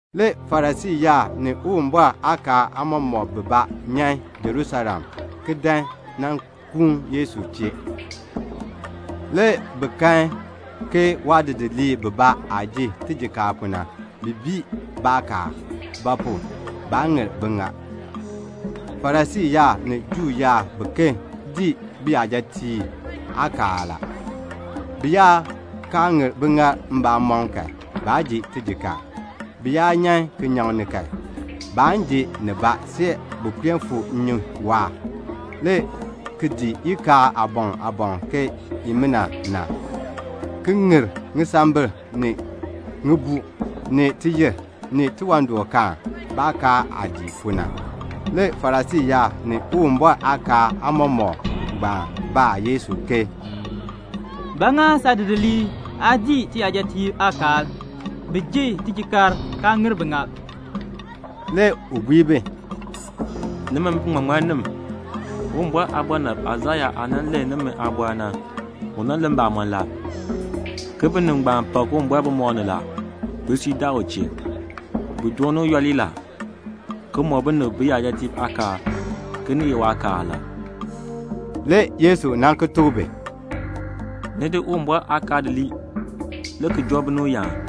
Le Farisii yaab ni Uwumbɔr aakaal aamɔmɔkb bibaa nyan Jerusalem, ki dan nan kuun Yesu chee. Le bi kan ke waadidiliib bibaa aah ji tijikaar pu na, bi bii baakaal; ba pu? baa ŋir biŋaal. Farisii yaab ni Juu yaab biken dii biyajatiib aakaal la. Bi yaa kaa ŋir biŋaal mbamɔm kan, baan ji tijikaar. Bi yaa nyan kinyaŋ ni kan, baan ji nibaa see bi puen fu nnyun waahr, le ki dii ikaal aaboŋ aaboŋ ke nimina na, ki ŋir ŋisambil, ni ŋibuu, ni tiyir, ni tiwandɔkaan, baakaal aah dii pu na. Le Farisii yaab, ni Uwumbɔr aakaal aamɔmɔkb ngbaan baa Yesu ke, "Ba ŋa saadidiliib aa dii tiyajatiib aakaal? Bi ji tijikaar kaa ŋir biŋaal." Le u bui bi, "Nimi biŋmaŋmannim, Uwumbɔr aabɔnabr Aisaya aah nan len nimi aabɔr na, u len mbamɔn la, ke 'Binib ngbaan pak Uwumbɔr bumɔb ni la. Bisui daa u chee. Bi dooni u yooli la, ki mɔk binib biyajatiib aakaal, ke ni ye waakaal la."' Le Yesu nan ki tuk bi, "Ni di Uwumbɔr aakaal di lii a, le ki joo binib yaan.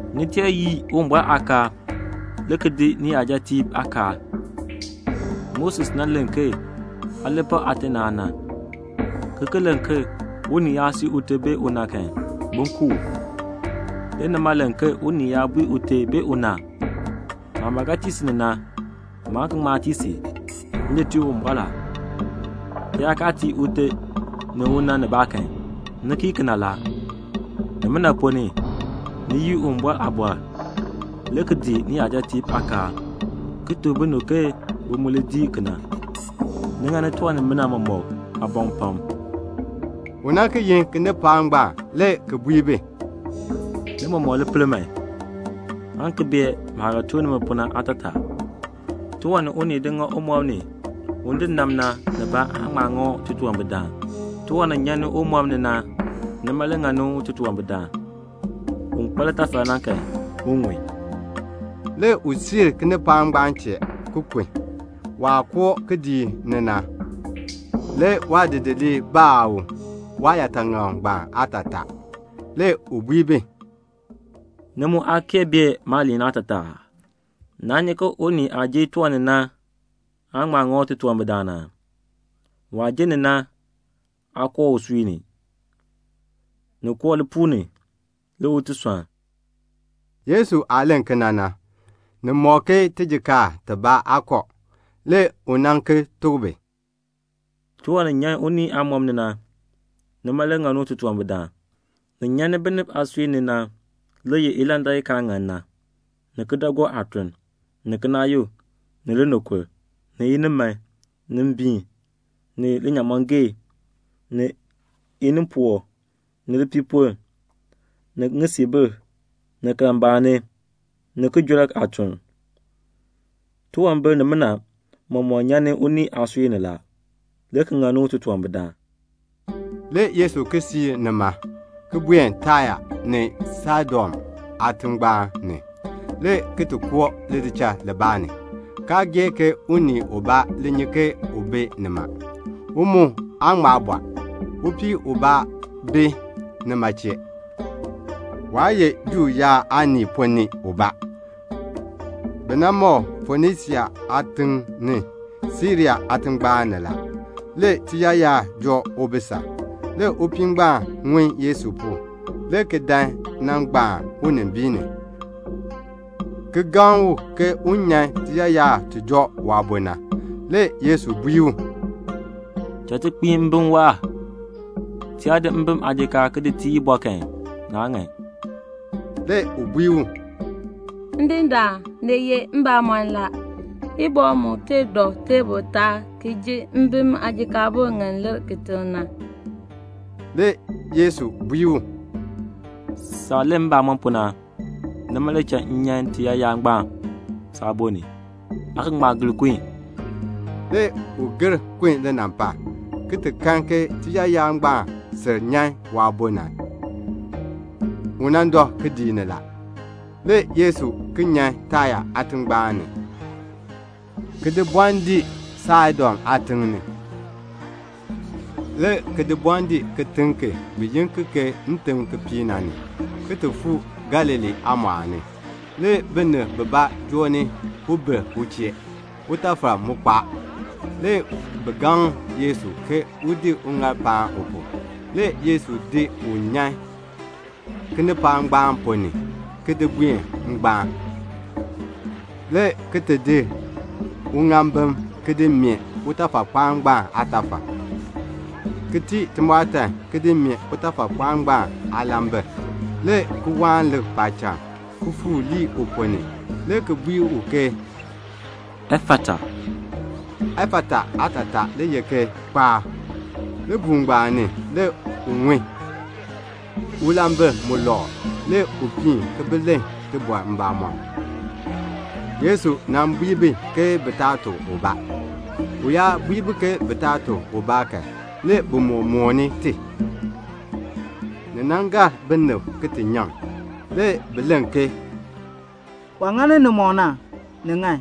"Ni tee yii Uwumbɔr aakaal, le ki dii niyajatiib aakaal. Moses nan len ke, 'Aa li pak aate ni aana,' ki ki len ke 'Unii yaa sii ute bee una kan, bin ku u.' Nimi, ni len ke unii yaa bui ute bee una 'Maah ba ga tii si ni na, maan ki ŋma tii si. M di tii Uwumbɔr la,' ki yaa kaa tii ute ni una nibaa kan, ni kii kena la. Nimina ponn ni, ni yii Uwumbɔr aaliin, le ki dii niyajatiib aakaal, ki tuk binib ke bi mu li dii kena. Ni ŋani tiwan nimina mɔmɔk aaboŋ pam." Le u ki yin kinipaak ngbaan, le ki bui bi, "Ni mɔmɔk li pel man, aan ki bee maah ga tuk nimi pu na aatataa. Tiwan ni unii di ŋa umɔb ni un di nab na nibaa aan ŋma ŋa u titunwambirdaan. Tiwan ni nyan umɔb ni na, nima le ŋani u titunwambirdaan. [ Un kpa litafal na kan, un ŋun.]" Le u siir kinipaak ngbaan chee, ki kun. Waah koo kidiik ni na, le waadidiliib baa u waayaataŋakl aatataa. Le u baa bi, "Ni mu aa kee bee maaliin aatataa aa? Naa nyi ke unii aah ji tiwan ni na aan ŋma ŋa u titunwambirdaan aa? Waah ji ni na aa koo usui ni. Ni koo lipuul ni, le u ti sɔnn." Yesu aah len kena na, ni mɔk ke tijikaar tibaa aa kɔ. Le u nan ki tuk bi, "Tiwan ni nyan unii aamɔb ni na, nima le ŋani u titunwambirdaan. Ni nyan ni binib aasui ni na le ye ilandak i kaa ŋan na, ni kidaagook aatuln, ni kinaayuk, ni linikur, ni iniman, ni mbiin, ni linyaamɔngee, ni inimpoo, ni lipiipoln, ni ŋisiibil, ni kalmbaani, ni kijɔrk aatuln. Tiwambir nimina mɔmɔk nyan ni unii aasui ni la, le ki ŋani u titunwambirdaan." Le Yesu siir nima, le ki buen Taya ni Saidon aatingbaan ni, le ki koo lidichal libaa ni, kaa gee ke unii ubaa li nyi ke u bi nima. U mu aa ŋma bɔr. Upii ubaa bi nima chee. Waa ye Juu yaab aanii ponn ni ubaa. Bi nan ma u Fonisia aatiŋ ni, Siria aatingbaan ni. Le tiyaayar joo ubisal. Le upii ngbaan ŋun Yesu pu, le ki dan nan gbaan unimbiin ni, le ki gaŋ u ke un nyan tiyaayar ti joo waabo na. Le Yesu bui u, "Cha ti kpiin mbim waahr. Ti yaa di mbim aajikaar ki di tii ibɔ kan, naa ŋan." Le u bui u, "Ndindaan, ni ye mbamɔn la; ibɔ mu tee dɔ teebl taab ki ji mbim aajikaabur ŋi lir kitiŋ na." Le Yesu bui u, "Saah len mbamɔn pu na, nima le cha m nyan tiyaayar ngbaan saabo ni. Aa ga ŋma gir kun." Le u gir kun linampal, le ki ti kan ke tiyaayar ngbaan sil nyan waabo ni. U dɔ kidiik ni la. Le Yesu ki nyan Taya aatingbaan ni, ki di bɔn dii Saidon aatiŋ ni, le ki di bɔn dii kitiŋ ki bi yi ki ke Ntimkipiik, le ki fuu Galilee aamɔɔl ni. Le binib bibaa joo ni ubir u chee. Utafal mu kpaa. Le bi gaŋ Yesu ke un di uŋaal ki di paan u pu. Le Yesu di u nyan kinipaak ngbaan ponn ni, ki di buen ngbaan, le ki di uŋaambim ki di meeh utafakpaa ngbaan aatafal, le ki tii timɔɔtan le ki di meeh utafakpaa ngbaan aalambil, le ki waan lik paacham, le ki fuur lii uponn ni, le ki bui u ke "Efata." Efata aatataa le ye ke "Kpaar." Libuul ngbaan ni, le u ŋun. Le ulambil mu lɔkr. Le u piin ki bi len tibɔr mbamɔm. Le Yesu bui bi ke bi taa tuk ubaa. U yaa bui bi ke bi taa tuk ubaa kan, le bi moo mooni ti. Le ni gar binib ki ti nyaŋ. Le bi len ke, "Waah ŋani nimɔk na, ni ŋan.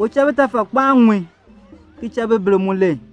U cha bitafakpaab ŋun, ki cha bibirb mu len."